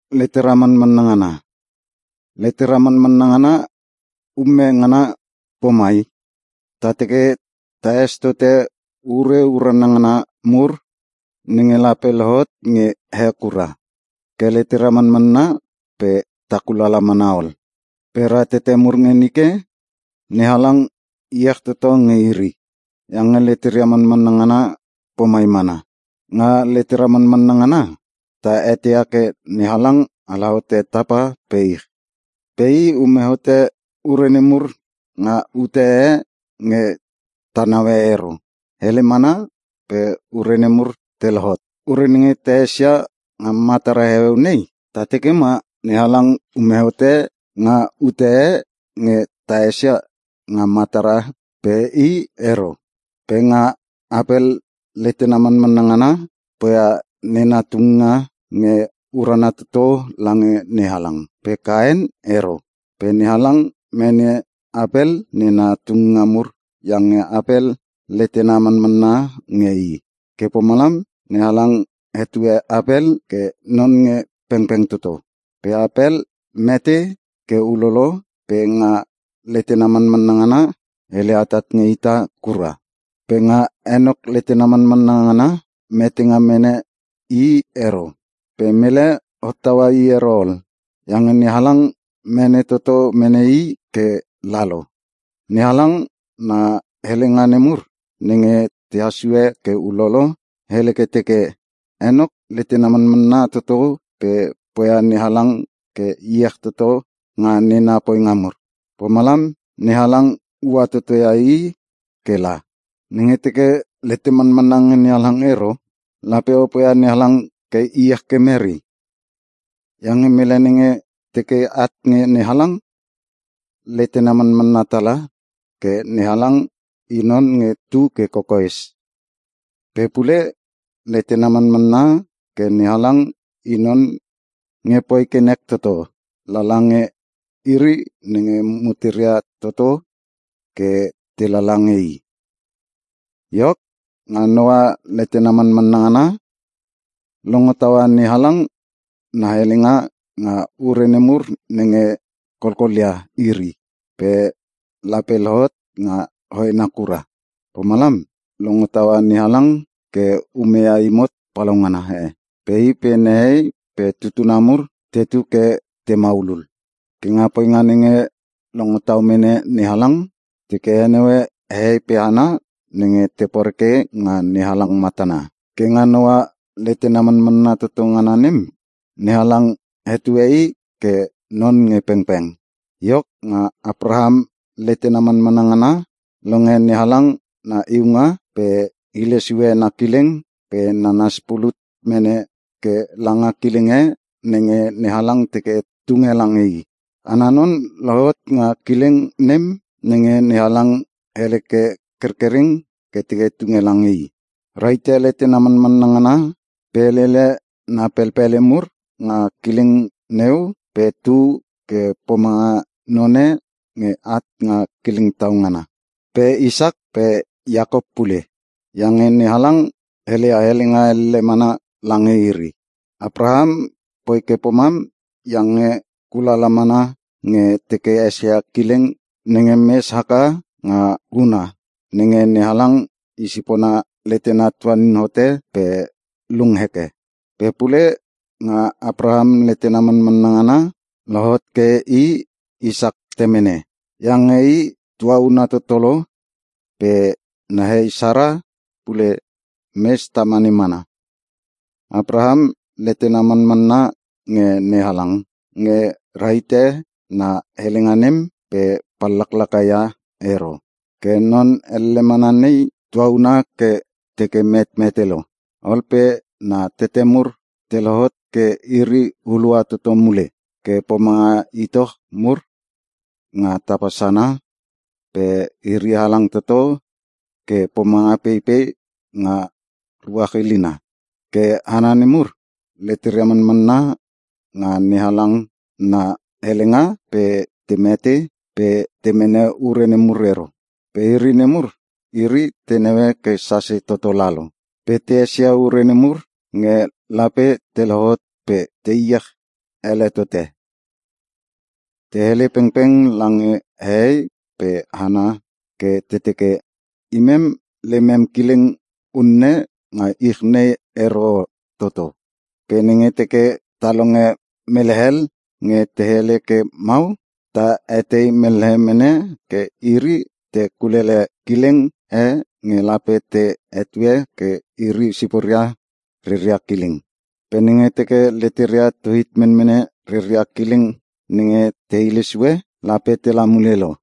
Letera manmanna ngana ume ngana pomai: Ta teke taes tote ure urana ngana mur nenge lape lohot nge he kura. Ke letera manmanna pe ta kulala mana ol. Pe ratete mur nge nike, NeHalang iech toto nge iri, iange leteria manmanna ngana pomai mana. Nga letera manmanna ngana, ta eteia ke NeHalang ala hote tapa pe ich. Pe i ume hote ure nemur nga ute e nge ta naue ero, hele mana pe ure nemur te lohot. Ure nenge ta esia nga matara heueu nei, ta teke ma NeHalang ume hote nga ute e nge ta esia nga matara, pe i ero. Pe nga Apel letena manmanna ngana, poia nena tunginga nge urana toto lange NeHalang. Pe Kaen ero. Pe NeHalang mene Apel nena tunginga mur iange Apel letena manmanna nge I. Ke pomalam NeHalang hetue Apel ke non nge pengpeng toto. Pe Apel mete ke ulolo pe nga letena manmanna ngana, hele atat nge ita kura. Pe nga Enok letena manmanna ngana, metenga mene i ero. Pe mele hottaua i ero ol iange NeHalang mene toto mene i ke lalo. NeHalang na helenga nemur nenge tehas sue ke ulolo, hele ke teke: Enok letena manmanna toto pe poia NeHalang ke iech toto nga nena poinga mur. Pomalam NeHalang ua toto ia i ke la. Nenge teke letem manmanna nge NeHalang ero, lape o poia NeHalang ke iech ke mere? Iange mele nenge teke at nge NeHalang, letena manmanna tala ke NeHalang I non nge tu ke kokoes. Pe pule letena manmanna ke NeHalang I non nge poi ke nek toto lala nge iri nenge muteria toto ke te lala nge I. Iok, nga Noah letena manmanna ngana, longo taua NeHalang na helenga nga ure nemur nenge kolkolia iri pe lape lohot nga hoena kura. Pomalam longo taua NeHalang ke ume ia imot palaungana e pe i pe nehei pe tutuna mur tetu ke te maulul. Ke nga poinga nenge longo tau mene NeHalang, teke heneue hehei pe hana nenge te poreke nga NeHalang matana. Ke nga Noah letena manmanna toto ngana nem, NeHalang hetue i ke non nge pengpeng. Iok, nga Apraham letena manmanna ngana, longe NeHalang na iunga pe hilesue na kileng pe nanas pulut mene ke langa kileng e nenge NeHalang teke tunge lange i. Ana non lohot nga kileng nem nenge NeHalang hele ke kerkereng ke teke tunge lange i. Rahite letena manmanna ngana pe lele na pelpele mur nga kileng neu pe tu ke pomanga none nge at nga kileng tau ngana. Pe Isak pe Iakop pule. Iange NeHalang heleia helenga elle mana lange iri. Apraham poi ke pomam iange kulala mana nge teke esia kileng nenge mes haka nga huna nenge NeHalang i sipona letena tuanin hote pe lung heke. Pe pule nga Apraham letena manmanna ngana, lohot ke i Isak temene. Iange i tuauna toto lo pe nehei Sara pule mes tamane mana. Apraham letena manmanna nge NeHalang nge rahite na helenga nem pe pallaklaka ia ero. Ke non elle mana nei, tuauna ke teke metmete lo. Ol pe na tete mur te lohot ke iri hulua toto mule ke pomanga itoch mur nga tapa sana pe iri halang toto ke pomanga peipei nga ruach ilina. Ke hana nemur, leteria manmanna nga NeHalang na helenga pe te mete pe te mene ure nemur ero. Pe ure nemur, iri te naue ke sase toto lalo pe te esia ure nemur nge lape te lohot pe te iech ele tote. Te hele pengpeng lange hehei pe hana ke te teke, “Imem lemem kileng unne nga ich nei ero toto.” Pe nenge teke ta longe mele hel nge te hele ke mau, ta etei mellehe mene ke iri te kulele kileng e nge lape te hetue ke iri siporia reria kileng. Pe nenge teke leteria tu hit menmene reria kileng nenge te hile sue, lape tela mule lo.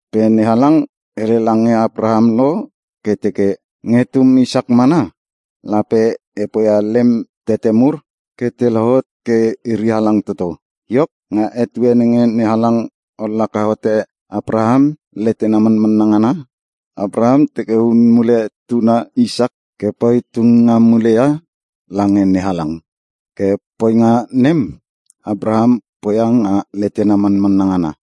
Pe NeHalang hele lange Apraham lo ke teke, “Nge tum Isak mana lape e poia lem tete mur, ke te lohot ke iri halang toto.” Iok, nga etue nenge NeHalang ollaka hote Apraham letena manmanna ngana, Apraham teke hun mule tuna Isak ke poi tunginga mule ia lange NeHalang. Ke poinga nem, Apraham poia nga letena manmanna ngana,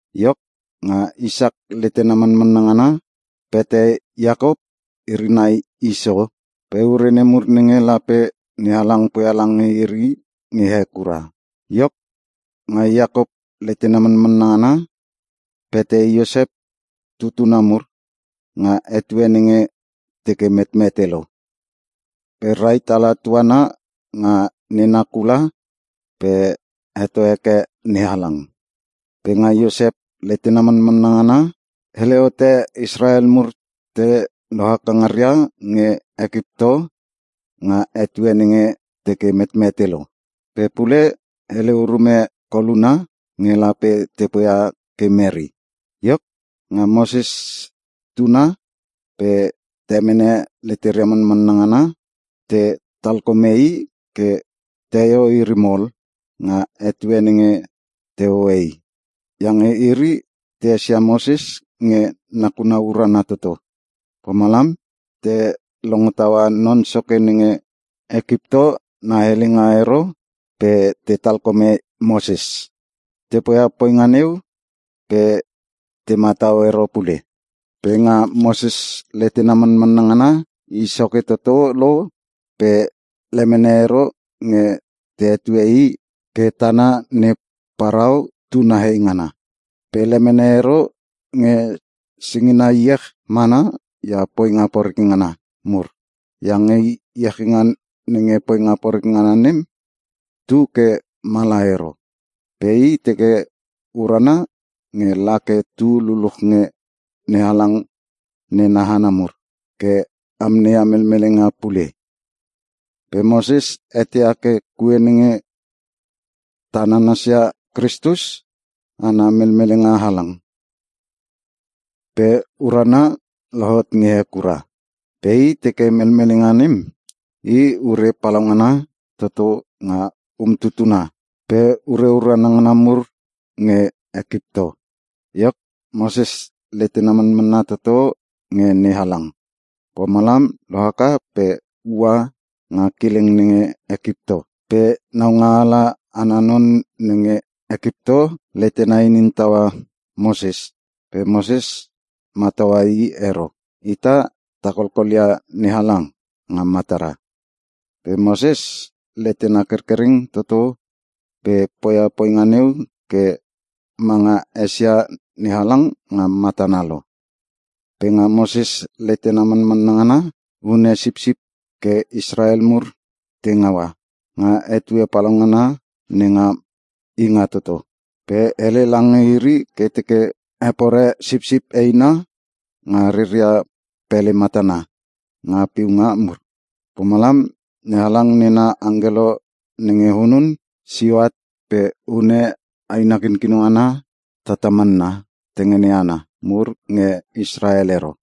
Iok, nga Isak letena manmanna ngana, pete Iakop iri nai Iso pe ure nemur nenge lape NeHalang poia lange iri nge he kura. Iok, nga Iakop letena manmanna ngana, pete Iosep tutuna mur nga etue nenge teke metmete lo. Pe rahit ala tuana nga nena kula pe heto heke NeHalang. Pe nga Iosep letena manmanna ngana, hele hote Israel mur te lohaka ngaria nge Ekipto, nga etue nenge teke metmete lo. Pe pule hele urume koluna nge lape te poia ke mere. Iok, nga Moses tana pe temene leteria manmanna ngana, te talkome i ke teio iri mol nga etue nenge te hoe i. Iange iri te esia Moses nge nakuna urana toto. Pomalam te longo taua non soke nenge Ekipto na helenga ero pe te talkome Moses. Te poia poinga neu pe te matau ero pule. Pe nga Moses letena manmanna ngana, i soke toto lo pe lemene ero nge te hetue i ke tana ne Parao tuna heingana. Pe lemene ero nge singina iech mana ia poinga poreke ngana mur. Iange iechinga nenga poinga poreke ngana nem tu ke mala ero. Pe i teke urana nge la ke tu luluch nge NeHalang nena hana mur, ke amneia melmelenga pule. Pe Moses eteia ke kue nenge ta nanasia Kristus, ana melmelenga halang, pe uruna lohot nge he kura. Pe i teke melmelenga nem, i ure palaungana toto nga umtutuna pe ure urana ngana mur nge Ekipto. Iok, Moses letena manmanna toto nge NeHalang. Pomalam lohaka pe ua nga kileng nenge Ekipto. Pe naungaala ana non nenge Ekipto letena inin taua Moses pe Moses mataua i ero. Ita ta kolkolia NeHalang nga matara. Pe Moses letena kerkereng toto pe poia poinga neu ke manga esia NeHalang nga matana lo. Pe nga Moses letena manmanna ngana, hune sipsip ke Israel mur te ngaua, nga etue palaungana nenga Ingatoto. Pe hele lange iri ke te hepore sipsip eina nga reria pele matana nga piunga mur. Pomalam NeHalang nena angkelo nenge hunun, sio at pe hune aina kinkino ngana tatamanna tengene ana mur nge Israel ero.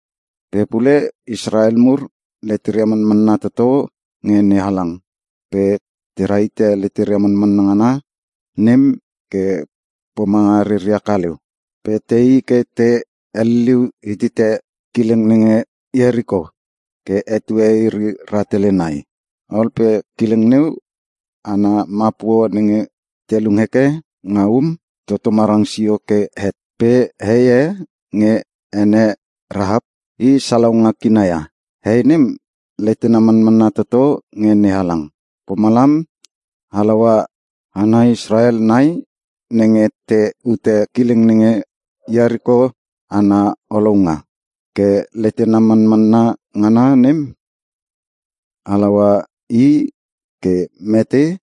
Pe pule Israel mur leteria manmanna toto nge NeHalang, pe te rahite leteria manmanna ngana nem ke pomanga reria kaleu. Pe tei ke te heliliu hitite kileng nenge Ieriko ke etue iri rahtele nai. Ol pe kileng neu ana mapuo nenge te lung heke nga um, toto marang sio ke het. Pe hei e nge ene Rahap, I salaunga kina ia. Hei nem letena manmanna toto nge NeHalang. Pomalam halaua hana Israel nai nenge te ute kileng nenge Ieriko ana olounga. Ke letena manmanna ngana nem, halaua i ke mete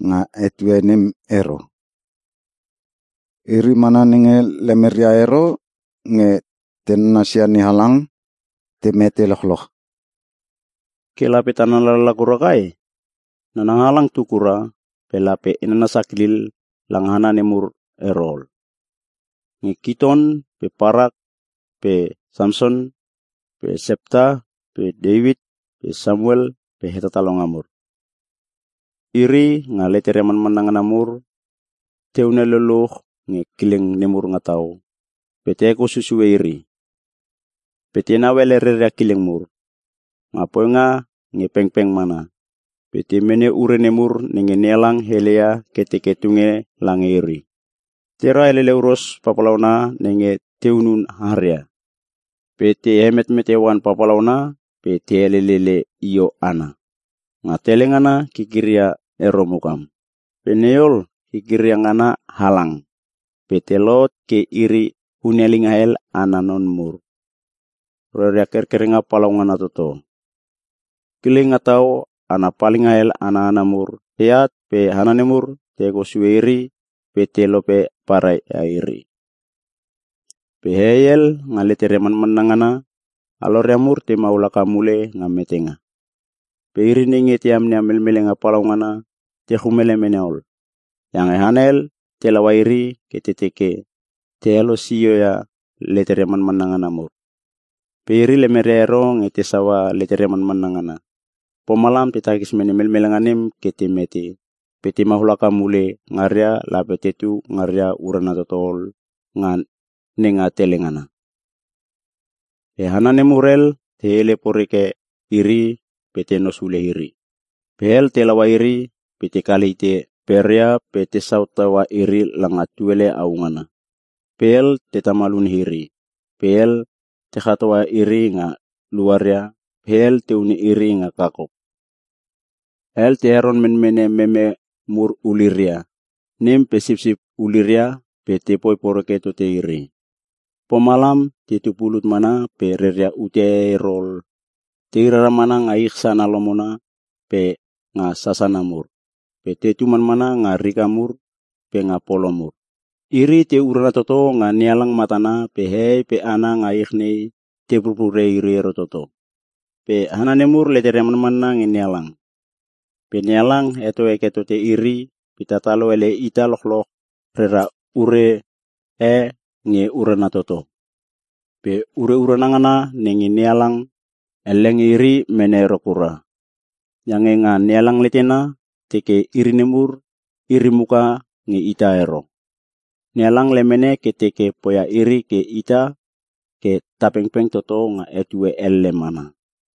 nga etue nem ero. Iri mana nenge lemeria ero nge te nanasia NeHalang, te mete lochloch. Ke lape ta nana lala kura kai? Nananga halang tu kura, pe lape e nana sakilil langa hana nemur ero ol. Nge Kition pe Parak pe Samson pe Septa pe Teuit pe Samuel pe Hetatalonga mur. Iri, nga leteria manmanna ngana mur, te hunel luluch nge kileng nemur nga tau, pe te hekou susue iri. Pe tenau ele reria kileng mur, nga poinga nge pengpeng mana, pe te mene ure nemur nenge NeHalang heleia, ke teke tunge lange iri. Tera elele huros papalauna nenge te hunun haria. Pe te hemetmete oan papalauna, pe te elelele io ana. Nga tele ngana, kikiria ero mukam. Pe nei ol, kikiria ngana halang, pe te lohot ke iri hunelinga hel ana non mur, nge reria kerkerenga palaungana toto. Kileng nga tau ana palinga hel ana hana mur teat pe hana nemur, te hekou sue iri pe te lope parai ia iri. Pe hehei hel, nga leteria manmanna ngana, aloria mur te maul haka mule nga metenga. Pe iri nenge te amneia melmelenga palaungana, te chumele mene ol. Iange hana hel te laua iri ke te teke te helosio ia leteria manmanna ngana mur. Pe iri lemeria ero nge te saua leteria manmanna ngana. Pomalam te takis mene melmelenga nem ke te mete, pe te maul haka mule ngaria lape tetu ngaria urana toto ol nga nenga tele ngana. Pe hana nemur hel te hele poreke iri pe tenos hule iri. Pe hel te laua iri pe te kale hite peria pe tesau teua iri langa tuele au ngana. Pe hel te tamal hune iri, pe hel te chatoa iri nga luaria, pe hel te hune iri nga kakop. Hel te heron menmene meme mur uliria, nem pe sipsip uliria pe te poi poreke tote iri. Pomalam tetu pulut mana pe reria ute e ero ol. Tei rara mana nga ich sana lomona pe nga sasana mur. Pe tetu manmana nga rika mur pe nga polo mur. Iri te urana toto nga NeHalang matana pe hehei pe hana nga ich nei te purpure iri ero toto. Pe hana nemur leteria manmanna nge NeHalang. Pe NeHalang heto heke tote iri pe tatalo ele ita lochloch rera ure e nge urana toto. Pe ure urana ngana nenge NeHalang heleia ke teke tunge nem, elle nge iri mene ero kura. Iange nga NeHalang letena, teke iri nemur iri muka nge ita ero. NeHalang lemene ke teke poia iri pe ita ke ta pengpeng toto nga etue elle mana.